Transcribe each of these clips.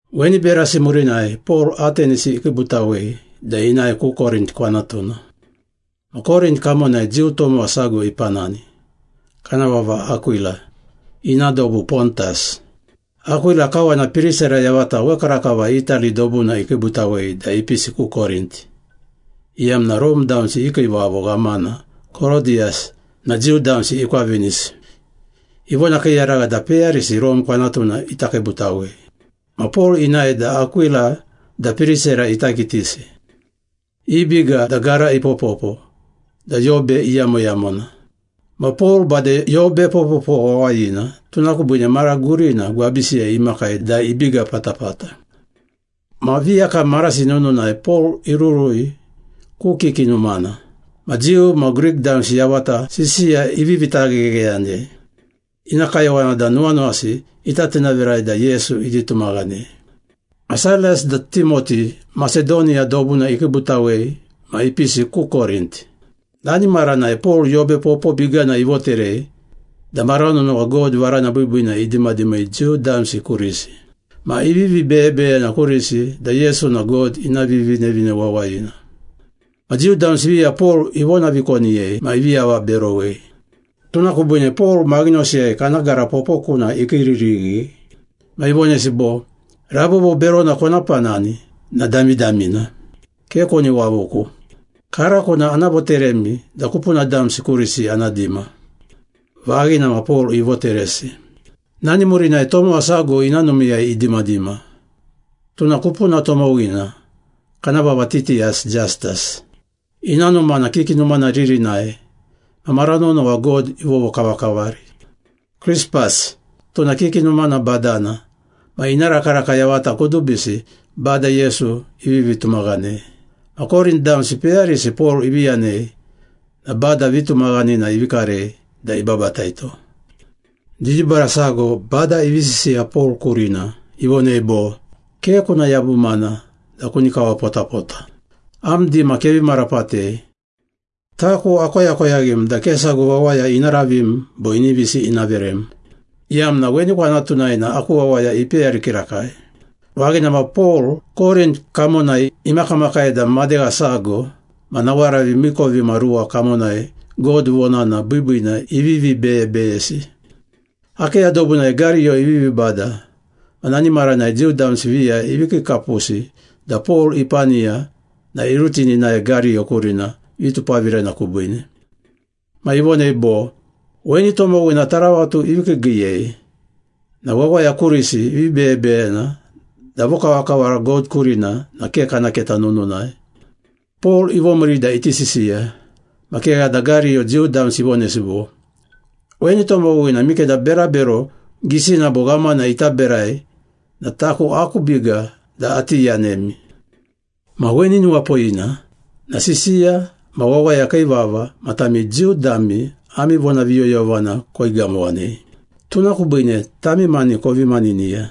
Weni berasi murinai Pol Atenisi ikiibutawei da inae ku Korint kwanatuna. Ma Korint kamonai Jiu tomowa sago ipanani, kana vava Akwila, ina dobu Pontas. Akwila kawana Pirisera yavata wekarakava Itali dobuna ikiibutawei da ipisi ku Korint, iyamna Rome damsi i kiivavo ghamana Korodiyus na Jiu damsi ikwavinisi, ivonakiiyaragha da peyarisi Rome kwanatuna ita kiibutawei. Ma Pol inae da Akwila da Pirisera ita kitisi. I biga da gara ipopopo da yobe iyamoyamona. Ma Pol bade yobe popopo wawayina, tuna kubiine mara gurina gwabisiyai imakai da ibiga patapata. Ma viyakam marasi nununai Pol irurui ku kiki numana. Ma Jiu ma Grik damsi yavata sisiya ivivi taghegheyanei. Ina kayowana da nuwanuwasi ita tinavirai da Yesu iti tumaghanei. Ma Sailas da Timoti Masedoniya dobuna ikiibutawei ma ipisi ku Korint. Nani maranai Pol yobe popo bigana ivoterei da mara nonowa God varana biibiina idimadimei Jiu damsi kurisi. Ma ivivi beyebeyena kurisi da Yesu na God ina Vivinevine Wawayina. Ma Jiu damsi viya Pol ivonavikoniyei ma ivi avaberowei. Tuna kubiine Pol maghinosiyai kana gara popokuna ikiiririghi. Ma ivonesi bo, “Rabobo berona kona panani na damidamina! Ke koni wavuku. Karako na ana voteremi da kupuna damsi kurisi ana dima.” Vaghina ma Pol ivoteresi. Nani murinai tomowa sago ina numiiyai idimadima, tuna kupuna tomowina kana vava Titiyas Jastas. Ina numa na kiki numana ririnai ma mara nonowa God ivovokavakavari. Krispas, tuna kiki numana badana ma ina rakaraka yavata kudubisi Bada Yesu ivivi tumaghanei. Ma Korint damsi peyarisi Pol ivi yanei na Bada vitumaghanina ivi karei da ibabataito. Didibara sago Bada ivi sisiya Pol kurina, ivonei bo, “Ke kuna yabumana da kuni kawapotapota. Am dima kevi marapatei. Taku akoyakoyaghim da ke sago wawaya ina ravim bo inivisi ina verem, iyamna weni kwanatunai na aku wawaya ipeyari kirakai.” Vaghina ma Pol Korint kamonai imakamakai da madegha sago ma nawaravi miikovimaruwa kamonai God vonana biibiina ivivi beyebeyesi. Akeya dobunai Gariyo ivivi bada ma nani maranai Jiu damsi viya ivi kiikapusi da Pol ipaniya na irutini inae Gariyo kurina vitupavirena kubiine. Ma ivonei bo, “Weni tomowina taravatu ivi kiigiiyei na wawaya kurisi ivi beyebeyena da vokavakavara God kurina na ke kana keta nununai.” Pol ivomiiri da iti sisiya, ma kegha da Gariyo Jiu damsi ivonesi bo, “Weni tomowina mikeda berabero gisina bo ghamana ita berai na taku aku biga da ati yanemi. Ma weni nuwapoyina na sisiya ma wawaya kii vava ma tami Jiu dami ami vonaviyoyovana koigamowanei. Tuna kubiine tami mani kovi maniniya.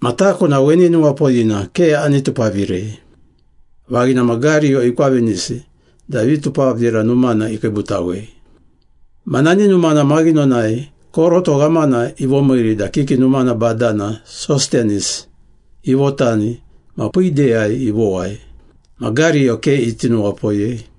Ma taku na weni nuwapoyina ke ani tupavirei.” Vaghina ma Gariyo ikwavinisi da vitupavira numana ikiibutawei. Ma nani numana maghinonai koroto ghamana ivomiiri da kiki numana badana Sostenis ivotani ma piideyai ivowai. Ma Gariyo ke iti nuwapoyei.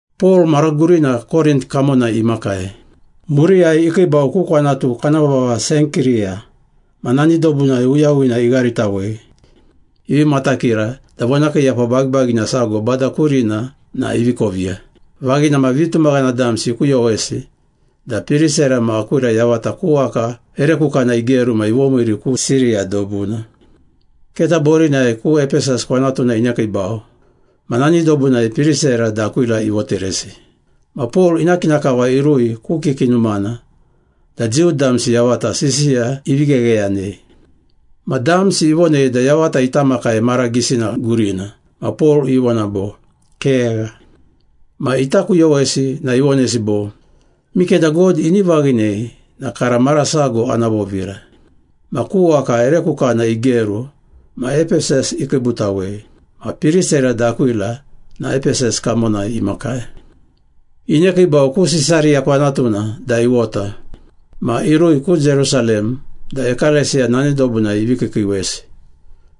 Pol mara gurina Korint kamonai imakai. Muriyai ikiibau ku kwanatu kana vava Senkiriya ma nani dobunai uyawina igharitawei, ivi matakira da vonakiiyapa bagibagina sago Bada kurina na ivi koviya. Vaghina ma vitumaghana damsi ikuyowesi da Pirisera ma Akwila yavata ku waka ere kukana igeru ma ivomiiri ku Siriya dobuna. Keta borinai ku Epesas kwanatuna inekiibau, ma nani dobunai Pirisera da Akwila ivoteresi. Ma Pol ina kina kava irui ku kiki numana da Jiu damsi yavata sisiya ivi ghegheyanei. Ma damsi ivonei da yavata ita makai mara gisina gurina ma Pol ivona bo, “Kegha.” Ma ita kuyowesi na ivonesi bo, “Mikeda God ini vaghinei na kara mara sago ana vovira.” Ma ku waka ere kukana igeru ma Epesas ikiibutawei. Ma Pirisera da Akwila na Epesas kamonai imakai. Inekiibau ku Sisariya kwanatuna da iwota. Ma irui ku Jerusalem da ekalesiya nani dobunai ivi kiikiiwesi.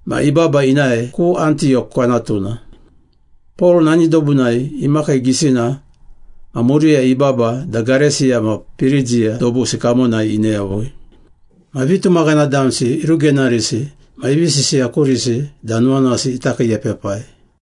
Ma ibaba inae ku Antiyok kwanatuna. Pol nani dobunai imakii gisina ma muriyai ibaba da Gareisiya ma Pirigiya dobusi kamona ine yavui. Ma vitumaghana damsi irugenarisi ma ivi sisiya kurisi da nuwanuwasi ita kiiepepai.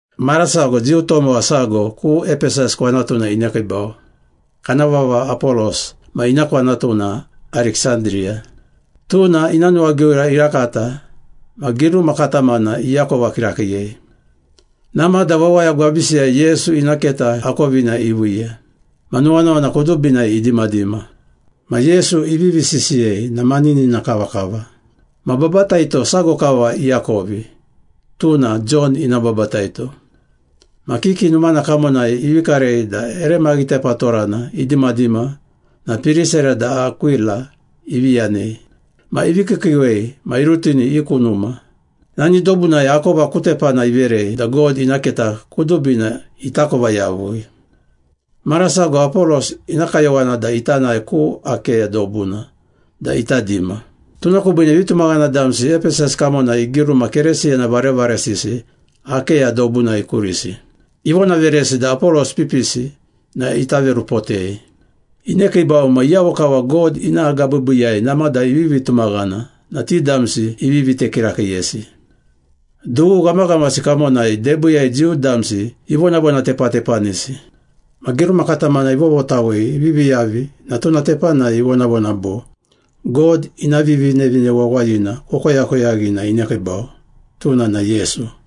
Mara sago Jiu tomowa sago ku Epesas kwanatuna inekiibau. Kana vava Apolos ma ina kwanatu na Ariksandiriya. Tuna ina nuwagiura irakata ma giruma katamana iakova kirakiiyei. Namada wawaya gwabisiyai Yesu ina keta akovina iviiya. Ma nuwanuwana kudubinai idimadima. Ma Yesu ivivi sisiyei na maninina kavakava. Ma babataito sago kava iakovi, tuna Jon ina babataito. Ma kiki numana kamonai ivi karei da ere maghitepatorana idimadima na Pirisera da Akwila ivi yanei. Ma ivi kiikiiwei ma irutini i ku numa. Nani dobunai akova ku tepana iverei da God ina keta kudubina itakova yavui. Mara sago Apolos ina kayowana da ita nae ku Akeya dobuna da ita dima. Tuna kubiine vitumaghana damsi Epesas kamonai igiruma Keresiyana varevaresisi Akeya dobunai kurisi. Ivonaveresi da Apolos ipipisi na ita verupotei. Inekiibau ma iyavo kava God ina agabiibiiyai namada ivivi tumaghana na ti damsi ivi vite kirakiiyesi. Dughu ghamaghamasi kamonai debiiyai Jiu damsi ivonavonatepatepanisi. Ma giruma katamana ivovotawei ivivi yavi na tuna tepanai ivonavona bo, “God ina Vivinevine Wawayina kokoyakoyaghi na inekiibau, tuna na Yesu.”